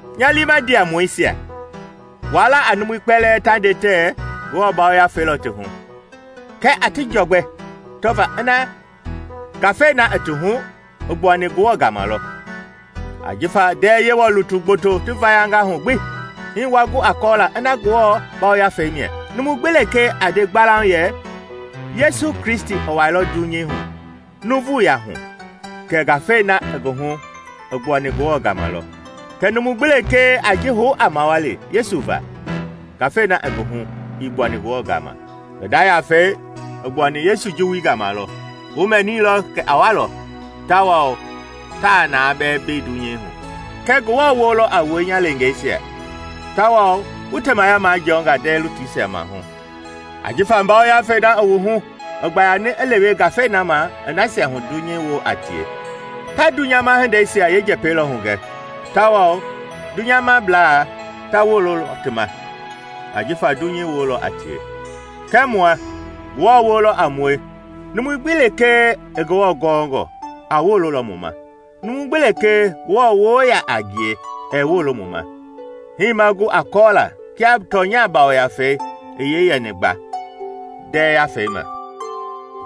Nya liima ndiamɔisia, waa la a numui kpɛlɛɛ ta nde tɛɛ Ngewɔ Yafei lɔ ti hu, kɛɛ a ti jɔgbɛ tɔva ina ngafei na i ti hu i gbuani Ngewɔ gama lɔ. Ajifa ndɛɛ Yewɔ lutu gboto ti vayanga hu gbi. Hii wa gu a kɔɔla ina Ngewɔ Yafei mia: numu gbi lekee a nde gbalauŋ yɛ Yesu Kristi i wailɔ dunyei hu nuuvuya hu, kɛ ngafei na i ngi hu i gbuani Ngewɔ gama lɔ. Kɛɛ numu gbi lekee a ji hou a mawali Yesu va, ngafei na i ngi hu ii gbuani Ngewɔ gama. Ngi nda yafei i gbuani Yesu Juwui gama lɔ; wu mɛniilɔ kɛ a walɔ, tawao taa na bɛɛ mbei dunyei hu. Kɛɛ Ngewɔ woo lɔ a wue, nya leengeisia, tawao wu temaya majɔnga ndɛɛ lutuisia maahu; ajifa Ngafei na i wu hu i gbayani i lewe ngafei na ma i nasia hu dunyei woo a tie. Ta dunyama hindeisia yeenjɛpɛi lɔ hugɛ tawao dunyamablaa ta wololɔ ti ma ajifa dunyei woo lɔ a tie. Kɛɛ mua, Ngewɔ woo lɔ a mue. Numu gbi lekee i Ngewɔ gɔɔngɔ a wololɔ mu ma; numu gbi lekee Ngewɔ woo yaa a ngie ɛɛ wolo mu ma. Hii ma gu a kɔɔla kia tɔnya Yafei i yee yɛni gba ndɛɛ yafei ma.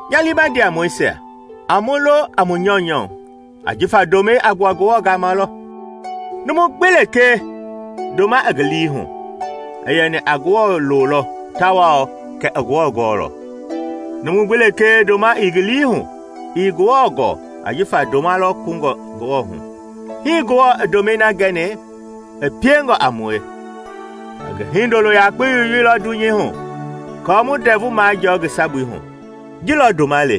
Nya liima ndiamɔisia, a mu lo a mu nyɔunyɔ ajifa ndomɛi a gbua Ngewɔ gama lɔ. Numu gbi lekee ndoma i ngi lii hu i yɛni a Ngewɔ loo lɔ tawao kɛ i Ngewɔ gɔɔlɔ. Numu gbi lekee ndoma ii ngi lii hu ii Ngewɔ gɔɔ ajifa ndoma lɔ kungɔ Ngewɔ hu. Hii Ngewɔ i ndomɛi na gɛni i piengɔ a mue, i ngi Hindolo yakpei yoyeilɔ dunyei hu aako mu ndɛvu majɔɔ ngi sabui hu. Ji lɔ ndoma le;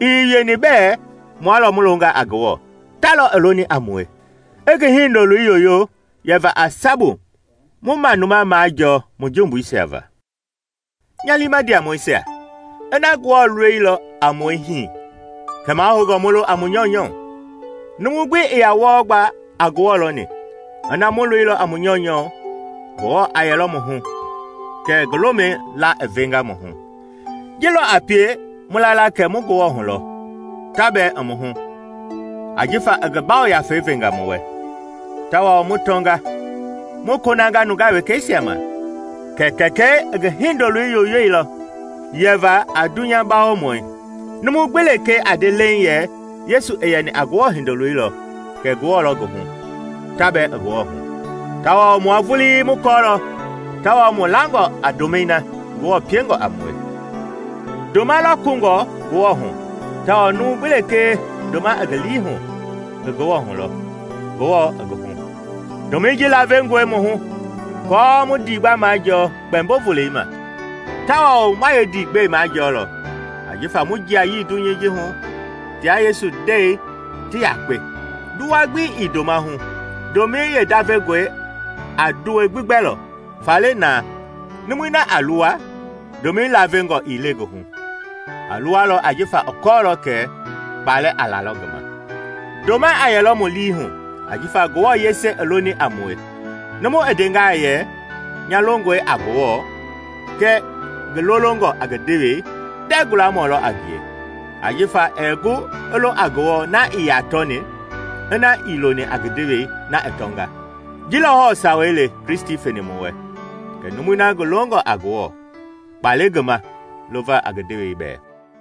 ii wieni bɛɛ mua lɔ mu longa a Ngewɔ, ta lɔ i loni a mue, i ngi Hindoloi yoyo yɛva a sabu mu manuma majɔɔ mu jumbuisia va. Nya liima ndiamɔisia, ina Ngewɔ i loilɔ a mue hii, kɛ mahoungɔ mu lo a mu nyɔunyɔ. Numu gbi ii yaa wɔɔ gba a Ngewɔ lɔni; ina mu loilɔ a mu nyɔunyɔ, Ngewɔ a yɛlɔ mu hu kɛ ngi lomɛi laa i venga mu hu. Ji lɔ a pie mu la la kɛ mu Ngewɔ hu lɔ, ta bɛɛ i mu hu ajifa i ngi Yafei venga mu wɛ. Tawao mu tɔnga, mu konanga nungaa wekɛisia ma kɛ Kɛkɛi i ngi Hindoloi yoyeilɔ yɛva a dunyabawomɔi. Numu gbi lekee a nde leiŋ yɛ Yesu i yɛni a Ngewɔ Hindoloi lɔ, kɛ Ngewɔ lɔ ngi hu, ta bɛɛ i Ngewɔ hu. Tawao mua vulii mu kɔɔlɔ tawao mu langɔ a ndomɛi na Ngewɔ piengɔ a mue. Ndoma lɔ kungɔ Ngewɔ hu tawao numu gbi lekee ndoma i ngi lii hu i Ngewɔ hu lɔ, Ngewɔ i ngi hu. Ndomɛi ji laavengɔe mu hu aako mu ndiigba majɔɔ Kpɛmbo Volei ma; tawao ma yeendiigbɛi majɔlɔ ajifa mu jiayii dunyei ji hu tia Yesu ndɛi ti yakpe. Nduwa gbi ii ndoma hu; ndomɛi yeendavengɔi a nduwɛi gbi gbɛlɔ. Faale naa, numui na a luwa, ndomɛi laavengɔ ii le ngi hu, a luwalɔ ajifa i kɔɔlɔ kɛ kpalɛ a lalɔ ngi ma. Ndoma a yɛlɔ mu lii hu ajifa Ngewɔ yese i loni a mue. Numu i ndengaa yɛ, “Nya longɔe a Ngewɔ,” kɛɛ ngi lolongɔ a ngi ndewei, ndɛɛ gualamɔ lɔ a ngie. Ajifa ɛɛ gu i lo a Ngewɔ na ii yaa tɔni, ina ii loni a ngi ndewei, na i tɔnga. Ji lɔ hɔɔ sawei le Kristi feni mu wɛ, kɛ numui na ngi longɔ a Ngewɔ kpa le ngi ma lova a ngi ndewei bɛɛ.